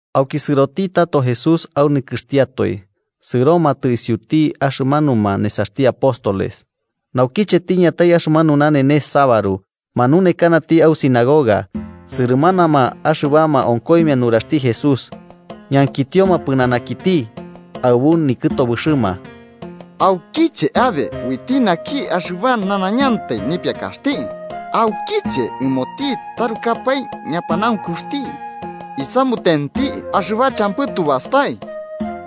Auki sɨroti tato Jesús au nikɨxtiatoe, sɨromatɨ isiuti axɨbamanuma nesaxti apóstoles. Naukiche tiñatai axɨmanu nanenes sabaru, manunekanati au sinagoga. Sɨrɨmanama axɨbama onkoimia nuraxti Jesús, ñankitioma pɨnanaki aɨbu nikɨtobɨxɨma: –¿Aukiche abe uiti naki axɨba nanañantai nipiakaxti? ¿Aukiche ɨmoti tarukapae ñapanaunkuxti isamutenti axɨba champɨ tu bastai?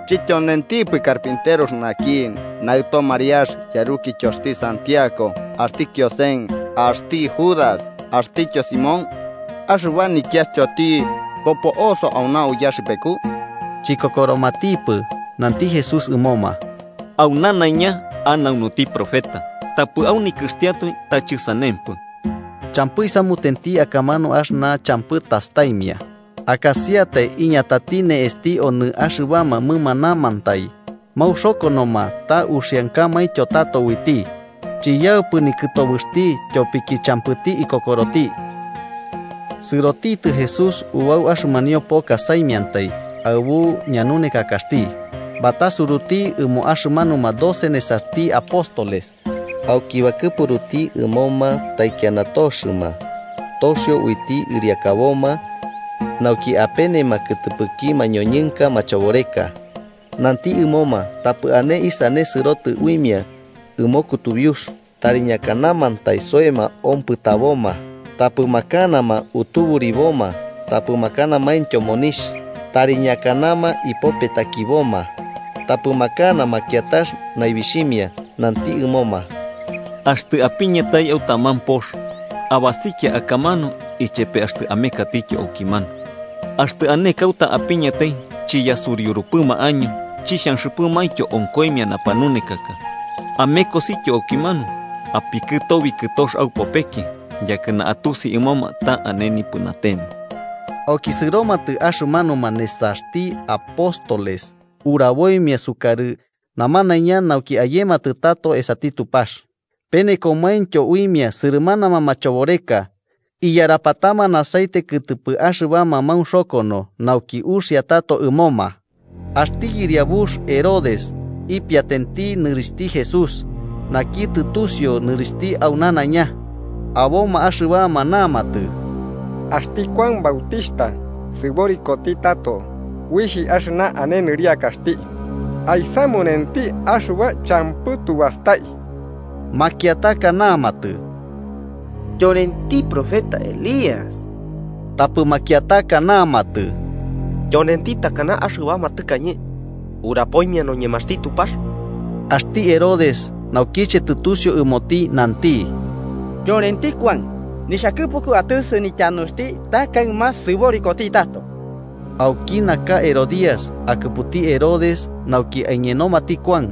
¿Chɨtyonentipɨ carpinterux naki, naɨto Mariax, yarukityoxti Santiago, axti Kiosen, axti Judas axtityo Simón? ¿Axɨba nikiastyoti bopo'oso auna uyaxɨpeku? Chikokoromatipɨ. Nanti Jesús ɨmoma: –Au nanaiña anaunuti profeta, tapɨ au nikɨxtiatoe ta chɨsanempɨ. Champɨ isamuteti akamanu axɨna champɨ tastaimia, akasiatai iñatati ne'esti onɨ axɨbama mɨmanamantai maunxokonoma ta uxiankamaintyo tato uiti. Chiyaupɨ nikɨtobɨxti tyopiki champɨti ikokoroti. Sɨrotitɨ Jesús ubau axɨmanio poka saimiantai, aɨbu ñanunekakaxti. Batasuruti ɨmo axɨmanuma doce nesaxti apóstoles, auki bakɨpuruti ɨmoma taikiana toxɨma, toxio uiti ɨriakaboma nauki apenema kɨtɨpɨki mañoñɨnka machoboreka. Nanti ɨmoma tapɨ ane isane sɨrotɨ uimia ɨmo kutubiux, tari ñakanamantai soema ompɨtaboma. Tapɨ makanama utuburiboma tapɨ makanamaintyo monixh. Tari ñakanama ipopetakiboma, tapɨ makanama kiatax naibixhimia. Nanti ɨmoma: –Axtɨ apiñatai au taman pox, abasikia akamanu ichepe axtɨ amekatityo aukimanu. Axtɨ ane kauta apiñatai chiyasuriurupɨma año chixhanxɨpɨmaintyo onkoimia napanunekaka, amekosityo aukimanu apikɨtobi kɨtox aupopeki, yakɨna atusi ɨmoma ta ane nipɨnatema. Auki sɨromatɨ axɨmanuma nesaxti apóstoles uraboimia sukarɨ namanaiña nauki ayematɨ tato esati Tupax. Penekomaintyo uimia sɨrɨmanama machoboreka, iyarapatama aceite kɨtɨpɨ axɨbama maunxokono nauki uxia tato ɨmoma. Axti yɨriabux Herodes ipiatenti nɨrixhti Jesús, naki tɨtusiu nɨrixhti au nanaiña. Aboma axɨbama namatɨ: “Axti Kuan Bautixhta sɨborikoti tato, uixh axɨna ane nɨriakaxti aisamunenti axɨba champɨ tubastai.” Makiataka namatɨ: “Tyonenti profeta Elías.” Tapɨ makiataka namatɨ: “Tyonenti takana axɨbama tɨkañe urapoimia noñemaxti Tupax.” Axti Herodes, naukiche tɨtusiu ɨmoti nanti: –Tyonenti Kuan. Nixhakɨpuku atɨsɨ nityanuxti ta kaɨma sɨborikoti tato. Auki naka Herodías, akɨputi Herodes nauki aiñenomati Kuan,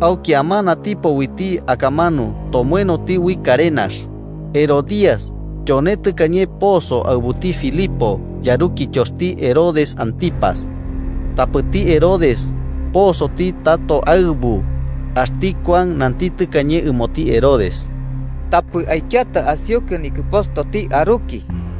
auki amanatipo uiti akamanu tomoenoti ui karenax. Herodías tyone tɨkañe poso aɨbuti Filipo, yarukityoxti Herodes Antipas, tapɨti Herodes posoti tato aɨbu. Axti Kuan nanti tɨkañe ɨmoti Herodes: “Tapɨ aikiata asiukɨ nikɨpostoti aruki.”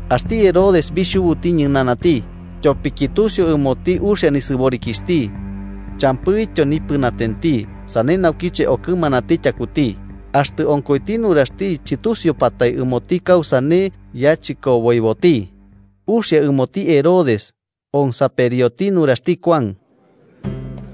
axti Herodes bixhubuti ñɨnanati, tyopiki tusiu ɨmoti uxia nisɨborikixhti, champɨityo nipɨnatenti, sane naukiche okɨmanati tyakuti. Axtɨ onkoiti nuraxti chɨtusiupatai ɨmoti kausane yachɨkoboiboti, uxia ɨmoti Herodes onsaperioti nuraxti Kuan.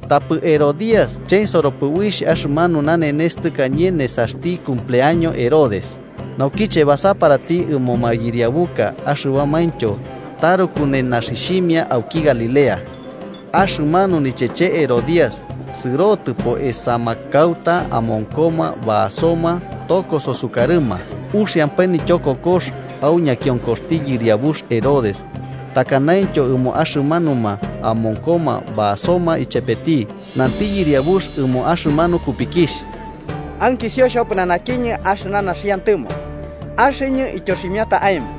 Tapɨ Herodías chensoropɨ uixh axɨmanu nanenes tɨkañe nesaxti cumpleaño Herodes, naukiche basaparati ɨmo mayɨriabuka axɨbamaintyo taruku nenaxixhimia auki Galilea. Axɨmanu nicheche Herodías sɨrotɨpo esama kauta amonkoma basoma tokoso sukarɨma. Uxiampae nityokokox au ñakionkoxti yɨriabux Herodes takanaintyo ɨmo axɨmanuma amonkoma basoma ichepeti, nanti yɨriabux ɨmo axɨmanu kupikixh: –Ankisio xhopɨnanakiñɨ axɨna naxiantɨmo, axɨñɨ ityoximiata aemo.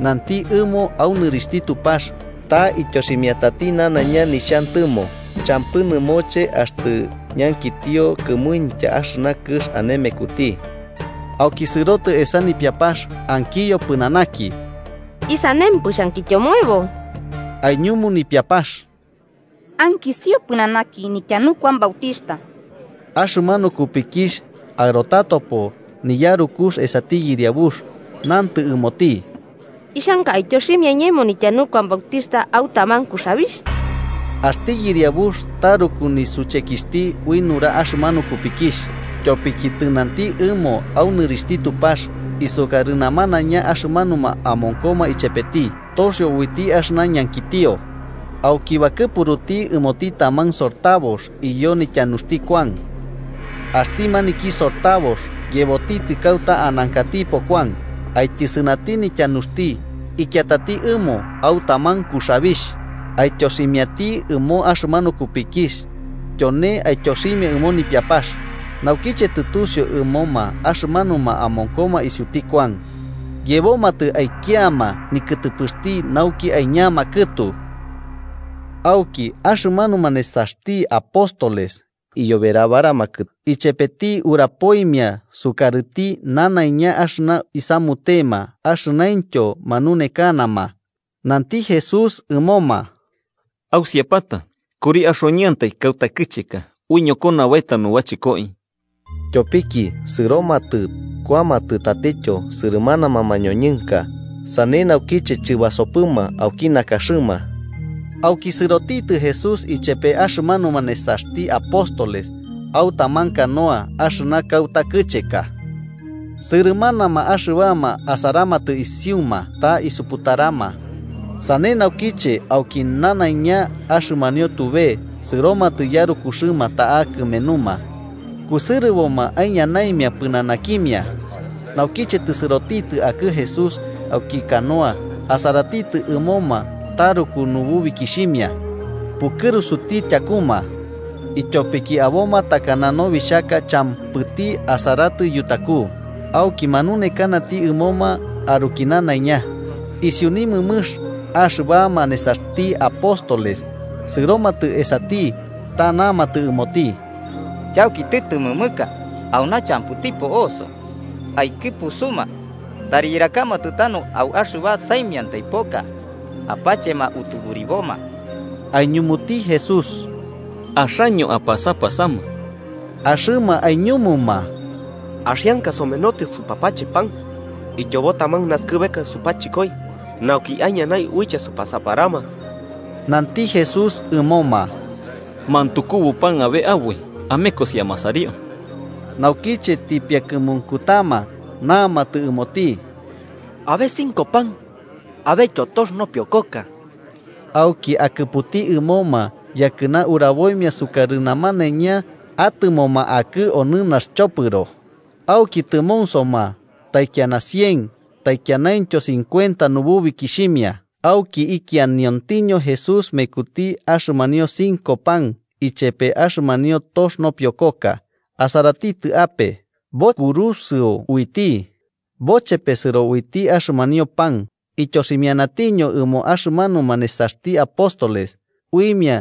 Nanti ɨmo au nɨrixhti Tupax, ta ityoximiatati nanaiña nixhantɨmo, champɨ nɨmoche axtɨ ñankitio kɨmuintya axɨna kɨx ane mekuti. Auki sɨrotɨ esa nipiapax, ankiyo pɨnanaki: –¿Isanempɨ xhankityomoebo? Aiñumu nipiapax: –Ankisio pɨnanaki nityanu Kuan Bautixhta. Axɨmanu kupikixh aɨrotatopo niyarukux esati yɨriabux, nantɨ ɨmoti: –Ixhanka aityoximia iñemo nityanu Kuan Bautixhta au taman kuxabixh. Axti yɨriabux taruku nisuchekixhti ui nura axɨmanu kupikixh. Tyopiki tɨnanti ɨmo au nɨrixhti Tupax isukarɨ namanaiña axɨmanuma amonkoma ichepeti, toxio uiti axɨna ñankitio. Auki bakɨpuruti ɨmoti taman sortabox iyo nityanuxti Kuan. Axti maniki sortabox yebotitɨ kauta anankatipo Kuan, aityɨsɨnati nityanuxti ikiatati ɨmo au taman kuxabixh. Aityoximiati ɨmo axɨmanu kupikixh, tyone aityoximia ɨmo nipiapax. Naukiche tɨtusiu ɨmoma axɨmanuma amonkoma isiuti Kuan, yebomatɨ aikiama nikɨtɨpɨxti nauki aiñama kɨtu. Auki, axɨmanuma nesaxti apóstoles iyoberabaramakɨ ichepeti urapoimia sukarɨti nanaiña axɨna isamutema, axɨnaintyo manunekanama. Nanti Jesús ɨmoma: –Ausiapata, kuri manauntaka kauta kɨcheka uiñokona baeta nubachɨkoi. Tyopiki sɨromatɨ kuamatɨ tatityo sɨrɨmanama mañoñɨnka, sane naukiche chɨbasopɨma auki nakaxɨma. Auki sɨrotitɨ Jesús ichepe axɨmanuma nesaxti apóstoles au taman canoa axɨna kauta kɨcheka. Sɨrɨmanama axɨbama asaramatɨ isiuma, ta isuputarama. Sane naukiche auki nanaiña axɨmanio tube sɨromatɨ yarukuxɨma ta'a kɨmenuma, kusɨrɨboma aiñanaimia pɨnanakimia. Naukiche tɨsɨrotitɨ akɨ'ɨ Jesús auki canoa asaratitɨ ɨmoma taruku nububikixhimia, pukɨrusuti tyakuma, ityopiki aboma takana nobixhaka champɨti asaratɨ yutaku, auki manunekanati ɨmoma aruki nanaiña. Isiu nimɨmɨx, axɨbama nesaxti apóstoles sɨromatɨ esati ta namatɨ ɨmoti: –Chauki tɨtɨmɨmɨka, auna champɨti po'oso. Aikɨpusuma, tari yɨrakamatɨ tanu au axɨba saimiantai poka apachema utuburiboma. Aiñumuti Jesús: –Axaño apasapasama. Axɨma aiñumuma: –¿Axianka somenotɨ supapache pan ityobo taman nasɨkɨbeka supachɨkoi nauki aiñanai uiche supasaparama? Nanti Jesús ɨmoma: –¿Mantukubo pan abe aboi? Amekosi amasario. Naukiche tipiakɨmunkutama, namatɨ ɨmoti: –Abe cinco pan abetyo tox nopiokoka. Auki akɨputi ɨmoma yakɨna uraboimia sukarɨ namanaiña atɨmoma akɨ onɨ naxchopɨro. Auki tɨmonsoma taikiana cien taikianaintyo cincuenta nububikixhimia. Auki ikianiontiño Jesús mekuti axɨmanio cinco pan ichepe axɨmanio tox nopiokoka, asaratitɨ ape, bokurusɨo uiti, bochepesɨro uiti axɨmanio pan ityoximianatiño ɨmo axɨmanuma nesaxti apóstoles uimia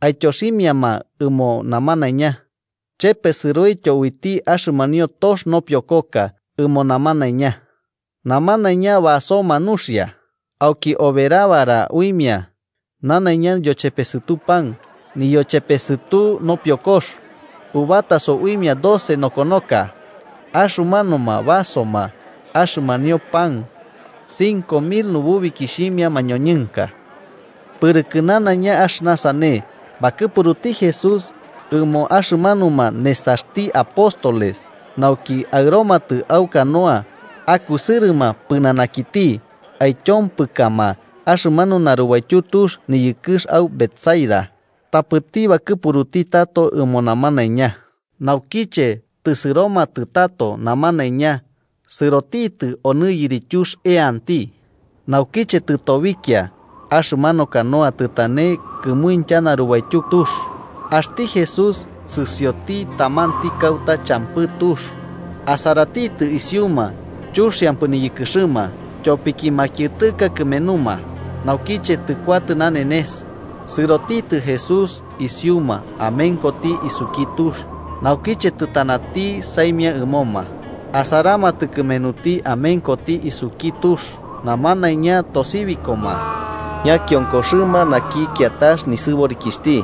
aityoximiama ɨmo namanaiña. Chepesɨroityo uiti axɨmanio tox nopiokoka ɨmo namanaiña. Namanaiña basoma nuxia. Auki oberabara uimia nanaiña niyochepesɨtu pan niyochepesɨtu nopiokox, ubataso uimia doce nokonoka. Axɨmanuma basoma axɨmanio pan cinco mil nububikixhimia mañoñɨnka. Pɨrɨkɨ nanaiña axɨna sane, bakɨpuruti Jesús ɨmo axɨmanuma nesaxti apóstoles nauki aɨromatɨ au canoa akusɨrɨma pɨnanakiti, aityompɨkama axɨmanu narubaityu tux niyɨkɨx au Betsaida, tapɨti bakɨpuruti tato ɨmo namanaiña. Naukiche tɨsɨromatɨ tato namanaiña, sɨrotitɨ onɨ yirityux eanti. Naukiche tɨtobikia, axɨmanu canoa tɨtane kɨmuintya narubaityu tux. Axti Jesús, sɨsioti tamanti kauta champɨ tux, asaratitɨ isiuma chuxiampɨ niyɨkɨxɨma, tyopiki makiɨtɨka kɨmenuma. Naukiche tɨkuatɨ nanenes, sɨrotitɨ Jesús isiuma amenkoti isuki tux, naukiche tɨtanati saimia ɨmoma. Asaramatɨ kɨmenuti amenkoti isuki tux, namanaiña tosibikoma, ñakionkoxɨma naki kiatax nisɨborikixhti.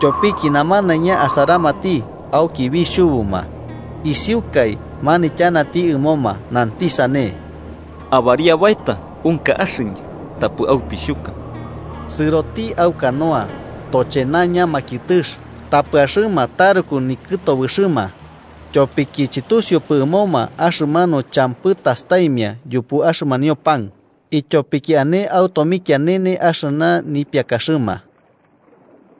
Tyopiki namanaiña asaramati auki bixhubuma. Isiukai manityanati ɨmoma, nanti sane: –¡Ariabaeta! ¡Unka axɨñɨ: tapɨ aupixhuka! Sɨroti au canoa, tochenaña makiɨtɨx. Tapɨ axɨma taruku nikɨtobɨxɨma, tyopiki chɨtusiupɨ ɨmoma axɨmanu champɨ tastaimia yupu axɨmanio pan, ityopiki ane au tomikianene axɨna nipiakaxɨma.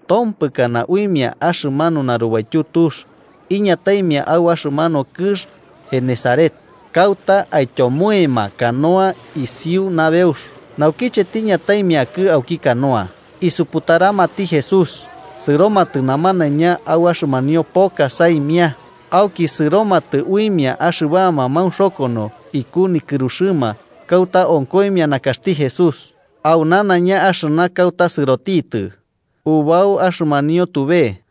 Tompɨkana uimia axɨmanu narubaityu tux iñataimia au axɨmanu kɨx Genesaret, kauta aityomoema canoa isiu nabeux. Naukiche tiñataimia akɨ auki canoa, isuputaramati Jesús. Sɨromatɨ namanaiña au axɨmanio poka saimia, auki sɨromatɨ uimia axɨbama maunxokono iku nikɨruxɨma kauta onkoimia nakaxti Jesús. Au nanaiña axɨna kauta sɨrotitɨ, ubau axɨmanio tube,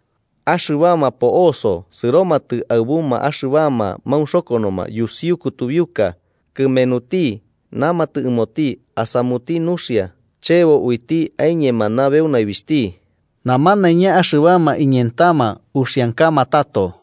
axɨbama po'oso sɨromatɨ aɨbuma axɨbama maunxokonoma yusiu kutubiuka kɨmenuti namatɨ ɨmoti asamuti nuxia chebo uiti aiñema nabeu naibixhti. Namanaiña axɨbama iñentama uxiankama tato.